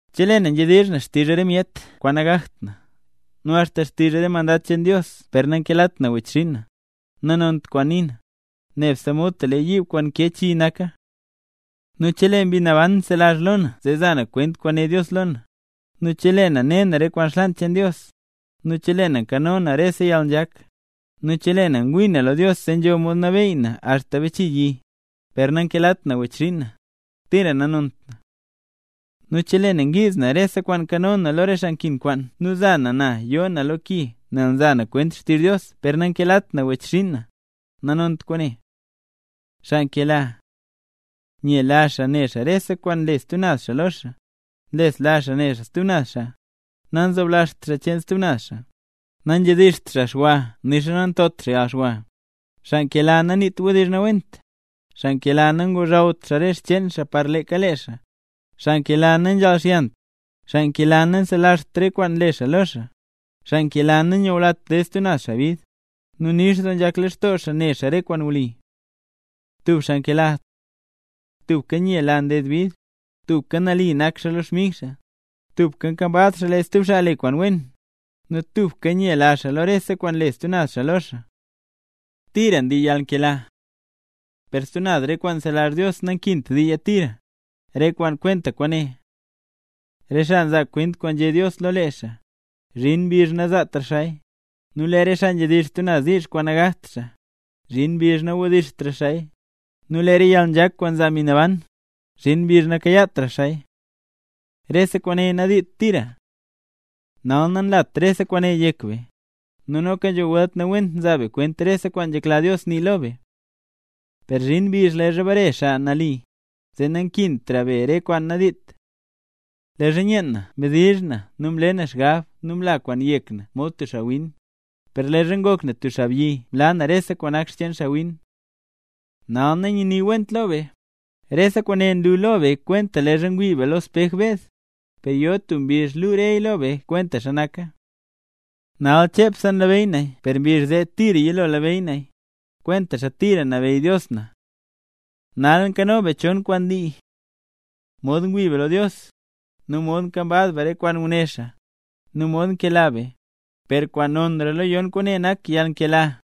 Chelee na nzhedizh na xtizh re myet kwaan nagakt na, nu axta xtizh mandad cheen Dios per nankelat na wechxinn na, nanont kwaana nii na, nebse mod tub lee yiib kwaan nkee chi naka. Nu chelee Mbi Naban nzelazh lo na zee za na kwent kwaan né Dios lo na, nu chelee na ne na re kwaan xlaan cheen Dios, nu chelee na nkano na rese yalnzhak, nu chelee na ngwii na lo Dios zee nzho mod nabeey na axta bachii yi, per nankelat na wechxinn na, tira nanont na. Nu chelee na ngiiz na rese kwaan nkano na lo re xaa nkin kwaan nu za na na yo na lo ki nel nza na kwent xtizh Dios per nankelat na wechxinn na, nanont kwaane. Xaa nkela: nyela xaa ne xaa rese kwaan nle stub naz xaa lo xaa, nlesla xaa ne xaa stub naz xaa, nanzoblazht xaa cheen stub naz xaa, nanzhedizht xwa xaa nixa nantot xaa yalxwa; xaa nkela naniit wdizh nawent, xaa nkela nangozhawt xaa rese xcheen xaa para leeka lee xaa, xaa nkela nanzhalxyant, xaa nkela nanselazht re kwaan nle xaa lo xaa, xaa nkela nanyulat ded stub xaa bid, nu nix doo nzhak lextoo xaa ne xaa re kwaan wli. Tub xaa nkela: Tubka nyela nded bid, tubka nali nak xaa lo xmig xaa, tubka nkambaz xaa lee stub xaa le kwaan wen, nu tubka nyela xaa lo rese kwaan nle stub xaa lo xaa. Tira ndii yalnkela. Per stub naz re kwaan nzelazh Dios nankint diiya tira, re kwaan kwenta kwaane: re xaa nzaa kwent kwaan nzhé Dios lo lee xaa, zhin mbizh nazaatra xaaya; nu lee re xaa nzhedizh stub diizh kwaan nagakt xaa, zhin mbizh nawdizhtra xaaya; nu lee re yalnzhak kwaan nzaa Mbi Naban, zhin mbizh nakayaatra xaaya. Rese kwaane nadiit tira. Nal nanlat rese kwaan yek be, nu noka nzho welt nawent nzaa be kwent rese kwaan nzhekla Dios nii lo be. Per zhin mbizh leezha bare Xaa Nali, zee nakintra be re kwaan nadiit. Leezha nyeen na mdizh na nu mle na xgab nu mla kwaan yek na mod tub xaawin, per leezha ngok na tub xaabyi mlaa na rese kwaan nak cheen xaawin. Nal nanyaniwenta lo be, nlu rese kwaan lo be kwenta leezha ngwii be lo spej beed, per yo tub mbizh kwaan luu reya lo be kwentaxa naka. Nal chepseya nlabeyy naya per mbizh zee tira yilo labeyy naya, kwentaxa tira nlabeyy Dios na. Nal nkano be chon kwaan ndii: mod ngwii be lo Dios, nu mod nkambaz be re kwaan nguné xaa, nu mod nkela be; per kwaan nonra lo yon kwaane nak yalnkela.